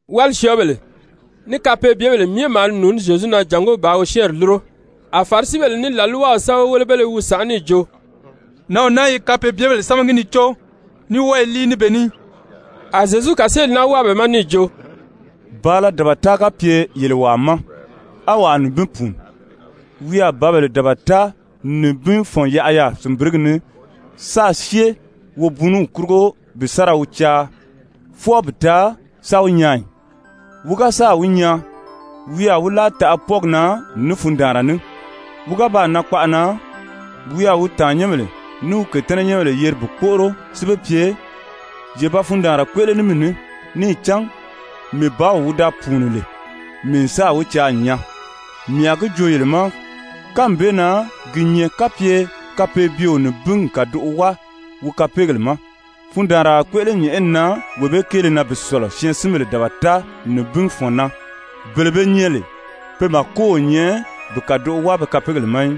Wálisyɔɔbèle ní kapeebyebèle myɛ maa ni nùuní Zyezu na jàngó bàā wi syɛ́ɛnri lúro. A Farisibèle ní làlwaw sɛ́bɛwelebéle i wi sànʔá níì jo: «Nǎnw naa i kapeebyebèle sámagi ni có, ní wɔ́ɔ i líi ní be ní.» A Zyezu kàseeli naa wáa be ma níì jo: «Bàala dabata ga pye yele wàa ma á wàa nibin pùuni, wi a bǎbèle dabata nibin fɔ̀n yaʔa yaà sìnbirigi ni sáā syée wobuuniw kurugo bi sa ra wi caa, fwɔɔ bi taa sa wi nyaa ì? Wi ga sáà wi nyaa, wi a wi láa taʔa pwɔ́ɔgi na ní fundaanra ní. Wi ga baa nan kpaʔa na, wi a wi tàannyɛnbèle ní wi kètɛ́nɛnyɛnbèle yeri bi kpóʔoro si be pye: ‹Ye ba fundaanra kpéʔele ní mii ní. Níì cán mii bǎw wi da pùuni lè, mii n sáà wi caa n nyaa.› Mii a gi joo yele ma, kánmi bee na gi nyɛ kapye kapeebyeo nibin n kàdoʔo wáa wi kapeegèle ma, fundaanra a kpéʔele nyɛ̀ʔɛni na wee bee kéele na bi sɔ̀lɔ syɛɛnsinbèle dabata nibin fɔ̀n kéele na, bele be nyɛ lè pe màko o nyɛ bi kàdoʔo wáa be kapeegèle ma í.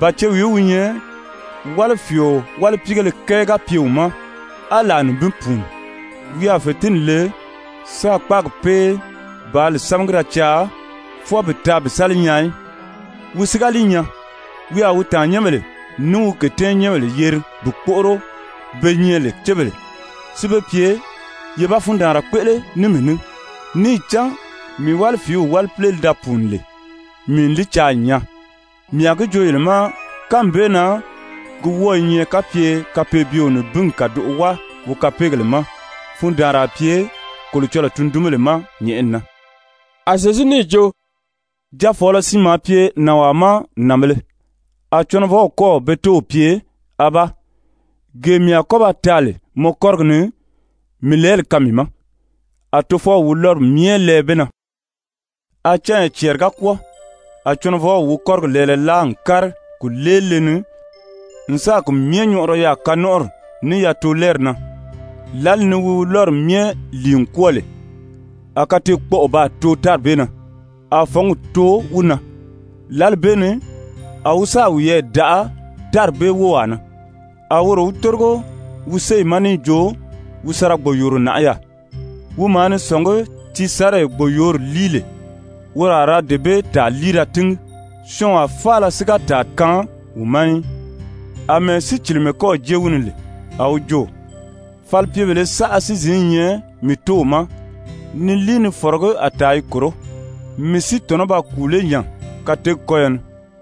«Ba cewìí wi nyɛ, wálifiio wálipiigéle kɛɛ ga pye wi ma á làa nibin pùuni, wi a fètinni le sáā kpáagi pée bàā li sámagi da caa, fwɔɔ bi taa bi sa li nyaa í? Wi si ga li nyaa, wi a wi tàannyɛnbèle ní wi kètɛ́nɛnyɛnbèle yeri bi kpóʔoro be nyɛ lè cébèle, si be pye: ‹Ye ba fundaanra kpéʔele ní mii ní. Níì cán mii wálifiiw wálipile li da pùuni lè, mii n li caa n nyaa.› Mii a gi joo yele ma, kánmi bee na gi wɔ́ɔ i nyɛ kapye kapeebyeo nibin n kàdoʔo wáa wi kapeegèle ma, fundaanra a pye Kolocɔlɔɔ tundunbèle ma nyɛ̀ʔɛni na.» A Zyezu níì jo: «Jaafɔɔlɔ siin maa pye nànwaa ma nànbēle. A cɔnɔvɔw kɔ́ɔ̀ be tóow pye: ‹Abaa, gee mii a kɔ́ ba taa lè mɔ kɔ́rigi ni, mii lɛɛli kaan mii ma.› A tofɔw wi lɔ́ri myɛ lɛɛ be na. A canya cɛɛri ga kwɔ́ɔ, a cɔnɔvɔw wi kɔ́rigi lɛɛlɛ láa n kári kùleelile ni n sáà ki myɛ nyɔʔɔrɔ yaà kanɔnʔɔri, ní yatoolɛɛri na. Lǎli ni wi lɔ́ri myɛ lìi n kwɔ́ɔ lè, a kateekpɔʔɔ baa too tári bee na, a fɔ̌ngi too wi na. Lǎli bee ni a wi sáà wiyɛɛ daʔa tári bee wówaa na, a woro wi tórigo wi séyi ma níì jo wi sa ra gbòyooro nàʔá yaà. Wi maa ni sɔ̀ngí tiisanree gbòyoori líi lè, woro a ra dee bee tàa líi da tíngi, syɔɔnwaa faala si ga tàa kaan wi ma í. Amɛɛ sícilimɛ kɔ́ɔ̀ jée wi ni lè, a wi jo: ‹Falipyebèlē saʔa si zǐn i nyɛ mii tóow ma ni líi ni fɔ̀rɔgí a tàa i kòró, mii si tɔ̀nɔ́ ba kùu lé nya kateegi kɔ́yɔ ni?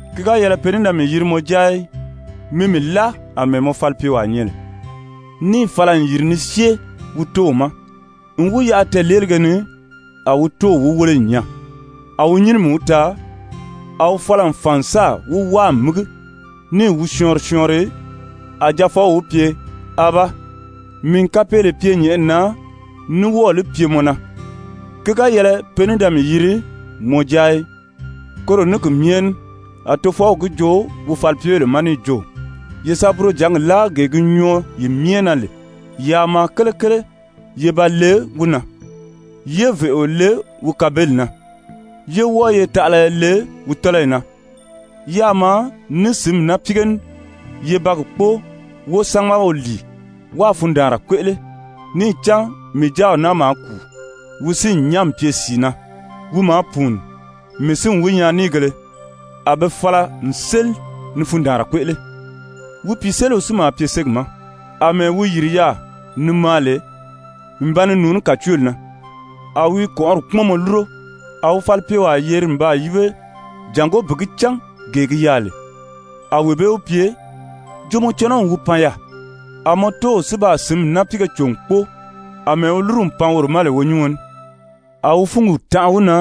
Ki ga yɛlɛ pe ní da mii yiri mɔ jáa í. Mi mii láa àmɛɛ mɔ falipyewaa nyɛ lè.› Níì fala n yìri ni syée wi tóow ma. N wi yaʔa tɛɛ̀leelige ni, a wi tóow wi wéle n nyaa, a wi nyínimi wi taa, a wi fala n fàn n sáà wi wáa n mígi níì wi syɔɔnri syɔɔnri. A jaafɔw wi pye: ‹Abaa, mii n kapeele pye nyɛ̀ʔɛni na, ní wɔ́ɔ̀ li pye mɔ na, ki ga yɛlɛ pe ní da mii yiri mɔ jáa í.› Koro ní ki myɛ ní a tofɔw gi joo wi falipyebèle ma níì jo: ‹Ye sa burojǎngi láa gee gi nyɔɔ yi myɛ na lè, yaa maa kelekele ye ba le wi na, yé vèʔeo le wi kabeli na, yé wɔ́ɔ ye taʔalaya le wi tɔ́lɔyi na, yáā maa ní sǐnmi náapiige ní ye ba gi kpóo, wo sámaga wo lìi, wáā fundaanra kpéʔele. Níì cán mii jáaw naa maa kùu, wi si n nyán n pye sìi na. Wi maa pùuni, mii si n wi nyaa níìgēle.› A be fala n séli ni fundaanra kpéʔele. Wi pìiseliw si maa pye ségi ma. Amɛɛ wi yìri yaà ni maa lè n ba ni nùuní kàcooli na, a wi i kɔ̀nʔɔri kpúmɔnmɔ lúro. A wi falipyewaa yeri n baa yíbe jàngó bi gi cán gee gi yaà lè. A wee bee wi pye: ‹Jo mɔ cɔnɔw wi pan yaà. A mɔ tóow si baa sǐnmi náapiige cò n kpóo, àmɛɛ wi lúru n pan woro ma lè wonyíɔn ní.› A wi fúngi tanʔa wi na,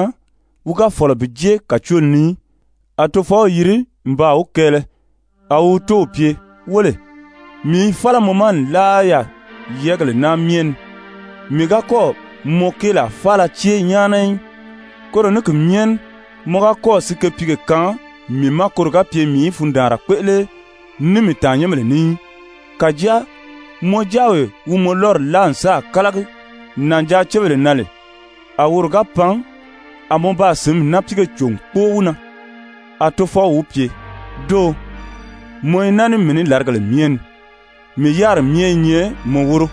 wi ga fɔ̀lɔ bi jée kàcooli ni í. A tofɔw yiri n baa wi kɛɛlɛ. A wi wi tóow pye: ‹Wéle, mii i fála mɔ ma nlaa yaà yɛ́ɛgèle naa myɛ ni, mii ga kɔ́ɔ̀ mɔ kéelaa faala cée nyáana í. Koro ní ki myɛ ní mɔ ga kɔ́ɔ̀ sikepiige kaan mii ma koro ga pye mii í fundaanra kpéʔele ní mii tàannyɛnbèle ní í. Kàjáa mɔ jáawee wi mɔ lɔ́ri láa n sáà kálagi nànjaacebèle na lè, a woro ga pan, a mɔ baa sǐnmi náapiige cò n kpóo wi na!› A tofɔw wi pye: ‹Dóō, mɔ i naa ní mii ní làrigèle myɛ ni, mii yáriri myɛ i nyɛ mɔ wóro.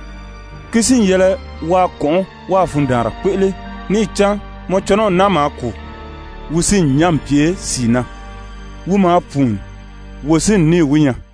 Ki si n yɛlɛ waa kɔ̀nʔɔ́ wáā fundaanra kpéʔele, níì cán mɔ cɔnɔw naa maa kùu, wi si n nyán n pye sìi na. Wi maa pùuni, wo si n níì wi nyaa.›»